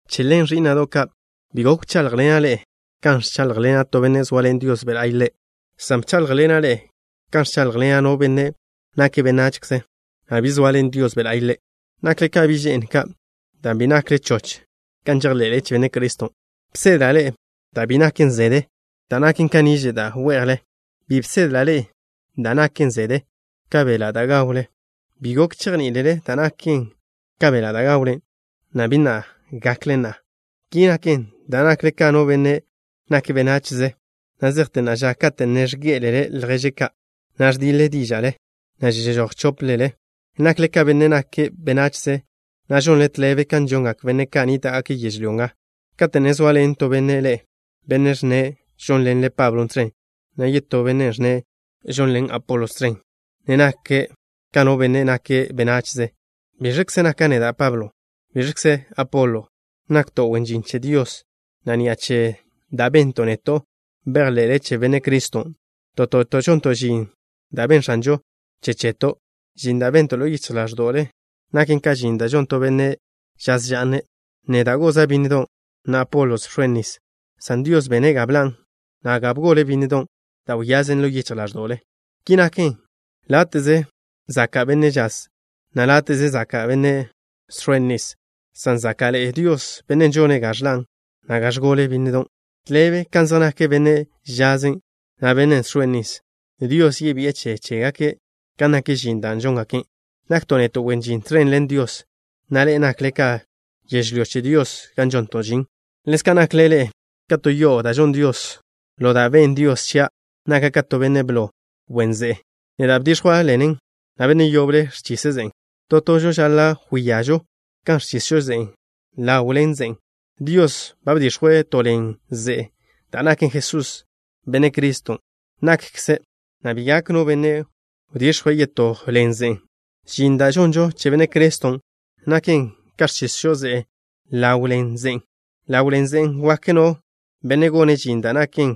Che ḻen, ẕí'na'do' ka', bi gok wcháḻjḻena' ḻe'e kan ẕcháḻjḻena' to benne' zoaḻen Dios Be' La'y ḻe', san bcháḻjḻena' ḻe'e kan ẕcháḻjḻena' no benne' nake' benachze, na' bi zoaḻen Dios Be' La'y ḻe'. Nakle ka bi' že'n ka', dan' bi nakle choch kan žejḻe'le che Benne' Criston'. Bsedla' ḻe'e da' bi naken zede, da' naken ka niže' da' we'jle. Bi bsedla' ḻe'e da' naken zede ka beḻa' da' gawlen. Bi gok chejní'ilele da' naken ka beḻa' da' gawlen, na' bi na' gakle na'a. Ki naken dan' nakle ka no benne' nake' benachze na' zejte na'a ža. Kate' ne ẕgé'elele lježle ka', na' ẕdiḻe díža'le, na' žežój chóplele, nakle ka no benne' nake' benachze, na' žonle tḻebe kan žongak benne' ka' nníta'gake' yežlyó nga. Kate' ne zoaḻen to benne' ḻe'e, benne' ẕnne' žónḻene' Pablo tẕen, na' yetó benne' ẕnne' žónḻene' Apolo tẕen, ne nakle ka no benne' nake' benachze. ¿Biẕkze naka' neda', Pablo? ¿Biẕkzen' Apolo? Nakto' wen žin che Dios, na' ni'a che da' bento' neto' bejḻe'le che Benne' Criston'. To toto' žonto' žin da' benn X̱anžon' che cheto'. Žin da' bento' ḻo yichj ḻáẕdo'le naken ka žin da' žon to benne' žaz ža'ne'. Neda' goza' bínnedo' ka', na' Apolo bx̱oen' nis, san Dios bene' ga bḻa', na' ga bgole bínnedon' da' wyazen ḻo yichj ḻáẕdo'le. Ki naken, láte'ze zaka' benne' žaz, na' láte'ze zaka' benne' žx̱oen' nis, san záka'ḻe'e Dios, Bennen' žone' ga ẕḻa', na' ga ẕgole bínnedon'. Tḻebe kan zej nak bennen' žazen', na' bennen' žx̱oen' nis. Dios yebi'e che chégake' kan nak žin da' žóngake'. Nakto' neto' wen žin tẕen ḻen Dios, na' ḻe'e nakle ka to yežlyó che Dios gan žonto' žin. Ḻezka' nakle ḻe'e ka to yo'o da' žon Dios. Ḻo da' benn Dios chia', naka' ka to benne' blo wen ze'e. Neda' bdix̱jwa' ḻen ze'e, na' benne' yoble ẕchise' ze'en'. To tožo žaḻa' wíažo kan ẕchisžo ze'e ḻaw ḻen ze'en'. Dios ba bdix̱jwe' to ḻen ze'e da' naken Jesús, Benne' Cristo na'kze, na' bi gak no benne' wdix̱jwe' yetó ḻen ze'e. Žin da' žonžo che Benne' Criston' naken ka ẕchisžo ze'e ḻaw ḻen ze'en'. Ḻaw ḻen ze'en' wak no benne' gone' žin da' naken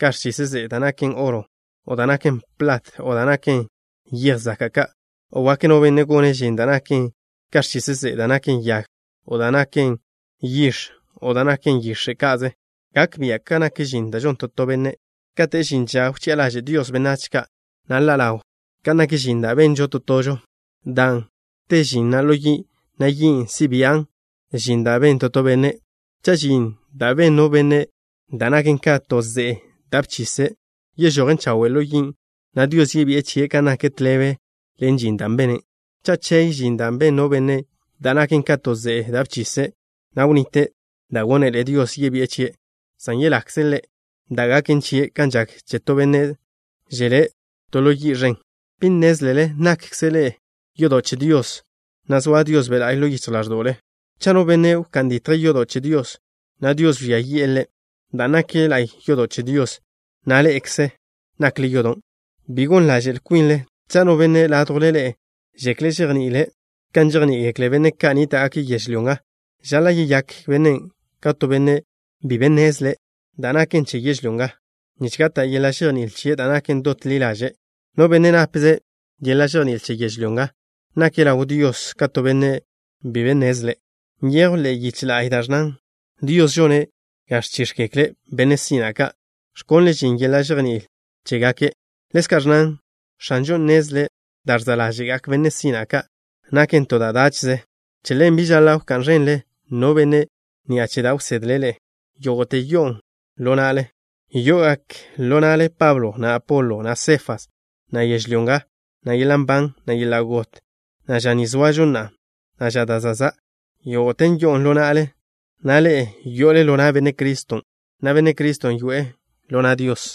ka ẕchise' ze'e da' naken oro, o da' naken plat, o da' naken yej zaka' ka', o wak no benne' gone' žin da' naken ka ẕchise' ze'e da' naken yag, o da' naken yix̱, o da' naken yix̱e' ka'ze. Gak bia' kan nak žin da' žon to to benne'. Kate' žin ža wchi'a ḻaže' Dios benách ka', na' ḻa' ḻaw kan nak žin da' benžo to tožo, dan' te žin na' ḻo yi', na' yin' si' bian' žin da' ben to to benne'. Cha' žin da' ben no benne', da' naken ka to ze'e da' bchise', yežojen chawe' ḻo yin', na' Dios yebi'e chie' kan nak tḻebe ḻen žin da' bene'. Cha' chey žin da' ben no benne' da' naken ka to ze'e da' bchise', na' wnite' da' gónele Dios yebi'e chie', san yelakze' ḻe', da' gaken chie' kan žak che to benne' želé' to ḻo yi' ẕen. ¿Bi nnézlele nákkzele ḻe'e yodo' che Dios, na' zoa Dios Be' La'y ḻo yichj ḻáẕdo'le? Cha' no benne' wká'n ditje' yodo' che Dios, na' Dios wžía yi'e ḻe', dan' nak la'y yodo' che Dios, na' ḻe'ekze nakle yodon'. Bi gon ḻaže'l kwinle. Cha' no benne' ládjwle ḻe'e žekle' žejní'iḻe'ele' kan žejní'igekle benne' ka' nníta'gake' yežlyó nga, žaḻa' yeyák bennen' ka to benne' bi be nnezle' da' naken che yežlyó nga, nich gata' yeḻa' žejní'il chie' da' naken dot ḻi ḻaže'. No benne' napze' yeḻa' žejní'il che yežlyó nga nake' ḻaw Dios ka to benne' bi be nnezle'. Nyejw ḻe'e yiche la'y da' ẕnnan: “Dios žone' ga ẕchíx̱gekle benne' sina' ka', ẕkonle' žin yeḻa' žejní'il chégake'.” Ḻezka' ẕnnan: “X̱anžo nnezle' da' ẕza' ḻáže'gak benne' sina' ka' naken to da' dáche'ze.” Che ḻen, bi žaḻa' wká'n ẕenle no benne' ni'a che da' wsedle' ḻe'e. Yógo'te yo'on ḻo na'le. Yo'ogak ḻo na'le Pablo, na' Apolo, na' Sefas, na' yežlyó nga, na' yeḻa' nban, na' yeḻa' got, na' ža ni zoažo na'a, na' ža da' za'. Yógo'te yó'ogaken ḻo na'le, na' ḻe'e yo'ole ḻo na' Benne' Criston', na' Benne' Criston' yoe'e ḻo na' Dios.